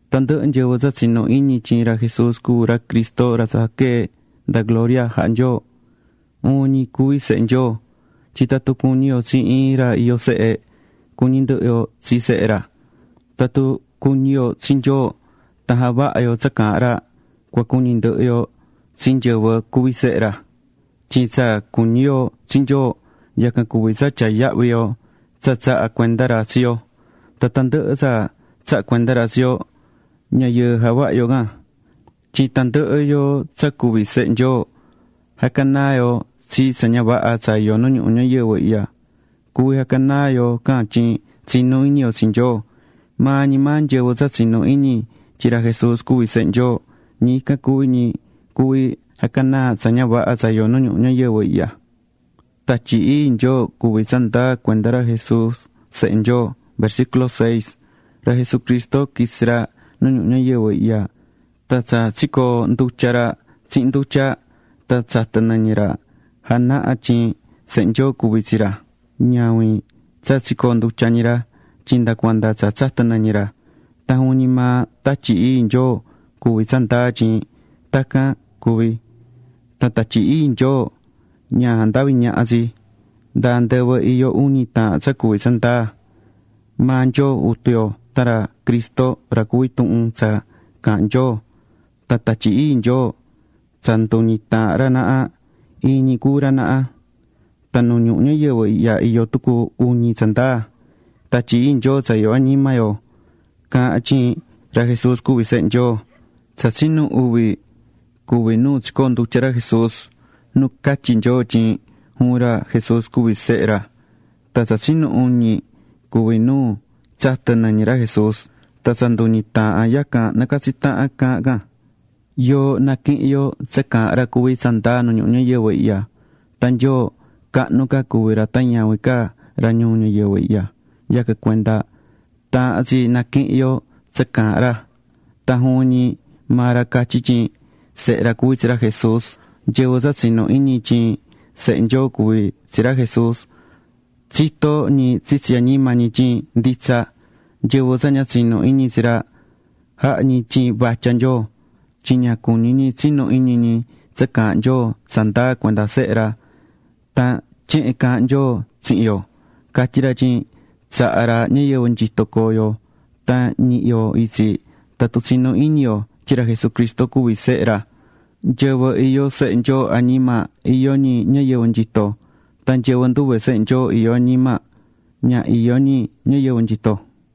Tandɨhɨ nyɨvɨ tsa tsinú iñi tyin ra Jesús cuví ra Cristo ra quee̱ nda gloria jaha̱ Nyoo, juvin ñi cuví sehe Nyoo. Tyin tatun cuñí yo tsi iin ra iyó sehe, cuñí ndɨhɨ yo tsi sehe ra. Tatun cuñí yo tsi Nyoo tan javahá yo tsa caahán ra, cua cuñi ndɨhɨ yo tsi nyɨvɨ cuví sehe ra. Tyin tsa cuñí yo tsi Nyoo yacan cuví tsa tyaá yahvi yo tsa tsaha̱ cuenda ra tsi yo. Tan tandɨhɨ tsa tsaha̱ cuenda ra tsi yo, ña yɨɨ javaha yo can. Tyin tandɨhɨ yoo tsa cuví sehe Nyoo, jahá canaa yo tsi tsa ña vaha tsa iyó nu ñuhu ñayɨvɨ ñayɨvɨ ihya. Cuví jaha canaa yo can tyin tsinú iñi yo tsi Nyoo. Maa ñi maa nyɨvɨ tsa tsinú iñi tyin ra Jesús cuví Sehe Nyoo, ñi ican cuví ñi cuví jahá canaa tsa ña vaha tsa iyó nu ñuhu ñayɨvɨ ihya.Tatyi Ii Nyoo cuví tsandaa cuenda ra Jesús Sehe Nyoo Ra Jesucristo quitsi̱ ra nu ñuhu ñayɨvɨ ihya. Tan tsa tsicoondutya̱ ra tsihin ndutya tan tsa tsatɨ̱ nɨñɨ ra janahá tyin Sehe Nyoo cuví tsi ra. Ñavin tsa tsicoondutya̱ ñi ra. tyin nda cuanda tsa tsatɨ̱ nɨñɨ ra. Tan juvin ñi maa Tatyi Ii Nyoo cuví tsandaa tyin tacan cuvi̱. Tan Tatyi Ii Nyoo ña jandaví ñaha tsi. Nda andɨvɨ iyó uñi taahan tsa cuví tsandaa: maa Nyoo Jutu yo tan ra Cristo ra cuví Tuhun tsa Caahán Nyoo, tan Tatyi Ii Nyoo. Tsa nduñi taahan ra naha, iin ñi cuví ra naha. Tan nu ñuhu ñayɨvɨ ihya iyó tucu uñi tsandaa: Tatyi Ii Nyoo tsa iyó añima yo caahán tyin ra Jesús cuví Sehe Nyoo. Tsa tsinu uvi cuví nu tsicoondutya̱ ra Jesús, nu catyi̱ Nyoo tyin juvin ra Jesús cuví Sehe ra. Tan tsa tsinu uñi cuví nu tsatɨ̱ nɨñɨ ra Jesús. Tan tsa nduñi taahan yacan nacatsí tahan caahán can. Yoo naquihín yo tsa caahán ra cuví tsandaa nu ñuhu ñayɨvɨ ihya. Tan Nyoo cahnu ca cuví ra tan ñavin ca ra ñuu ñayɨvɨ ihya. Yacan cuenda taahán tsi naquihin yo tsa caahán ra, tan juvin ñi maa ra catyi̱ tyin Sehe ra cuví tsi ra Jesús. Nyɨvɨ tsa tsinú iñi tyin Sehe Nyoo cuví tsi ra Jesús, tsitó ñi tsitsi añima ñi tyin nditsa. Nyɨvɨ tsa ña tsinú iñi tsi ra, jahá ñi tyin vatya Nyoo, tyin ña cuñí ñi tsinu iñi ñi tsa caahán Nyoo tsandaa cuenda Sehe ra. Tan tyehen caahán Nyoo tsihin yo: Catyí ra tyin tsaha̱ ra ñayɨvɨ nyito coo yo tan ñihi yo itsi tatun tsinú iñi yo tyin ra Jesucristo cuví Sehe ra. Nyɨvɨ iyó Sehe Nyoo añima, iyó ñi ñayɨvɨ nyito. Tan nyɨvɨ nduve Sehe Nyoo iyó añima, ña iyó ñi ñayɨvɨ nyito.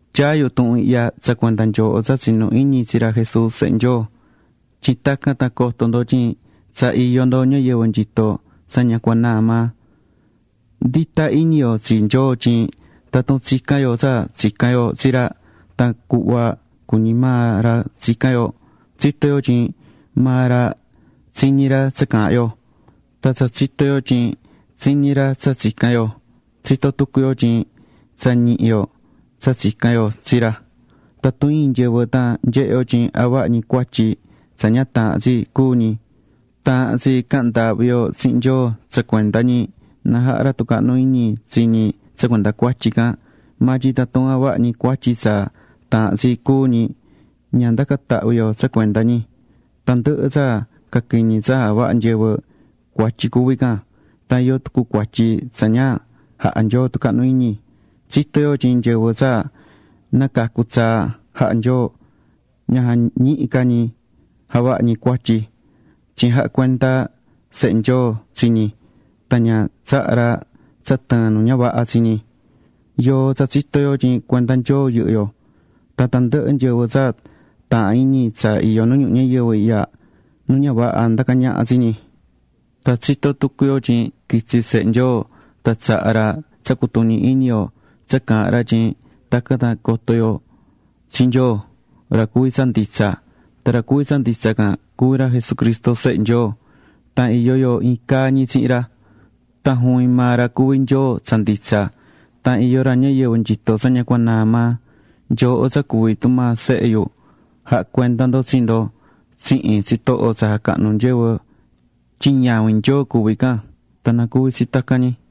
Tyaá yu tuhun ihya tsa cuenda nyooho tsa tsinú iñi tsi ra Jesús Sehe Nyoo, tyin tacan tan coto ndo tyin tsa iyó ndo ñayɨvɨ nyito tsa ña cua naa maa. Ndita iñi yo tsi Nyoo tyin tatun tsicán yo tsa tsicán yo tsi ra tan cuhva cuñí maa ra tsicán yo, tsitó yo tyin maa ra tsiñí ra tsa caahán yo. Tan tsa tsitó yo tyin tsiñí ra tsa tsicán yo, tsitó tucu yo tyin tsa ñihi̱ yo tsa tsica̱n yo tsi ra. Tatun iin nyɨvɨ tan nyehe yo tyin javahá ñi cuatyi tsa ña taahán tsi cúu ñi, taahán tsi cahan ndaahvi yo tsihin Nyoo tsa cuenda ñi na jaha ra tucahnu iñi tsi ñi tsa cuenda cuatyi can. Maa tyin tatun javahá ñi cuatyi tsa taahán tsi cúu ñi, ña ndacan tahvi yo tsa cuenda ñi. Tandɨhɨ tsa caquiñi tsa javahá nyɨvɨ, cuatyi cuví can. Tan iyó tucu cuatyi tsa ña jaha Nyoo tucahnu iñi. Tsitó yo tyin nyɨvɨ tsa nacacu̱ tsaa jaha̱ Nyoo, ña jañihí ca ñi javaha ñi cuatyi. Tyin jahá cuenda Sehe Nyoo tsi ñi tan ña tsahá ra tsa tɨɨn nu ña vaha tsi ñi. Yoo tsa tsitó yo tyin cuenda Nyoo yɨhɨ́ yo. Tan tandɨhɨ nyɨvɨ tsa taahán iñi tsa iyó nu ñuhu ñayɨvɨ ihya, nu ña vaha ndacá ñaha tsi ñi. Tan tsitó tucu yo tyin quitsi̱ Sehe Nyoo, tan tsaha̱ ra tsa cutuñi iñi yo tsa caahán ra tyin tacan tan nacoto yo tsi Nyoo, ra cuví tsa nditsa. Tan ra cuví tsa nditsa can, cuví ra Jesucristo Sehe Nyoo. Tan iyó yo iin caa ñi tsihin ra. Tan juvin maa ra cuví Nyoo tsa nditsa. Tan iyó ra ñayɨvɨ nyito tsa ña cua naa maa. Nyooho tsa cuví tumaa sehe yu, ja̱ha cuenda ndo tsi ndo tsihin tsitoho tsa jacahnú nyɨvɨ, tyin ñavin Nyoo cuví can. Tan na cuvi tsi tacan ñi.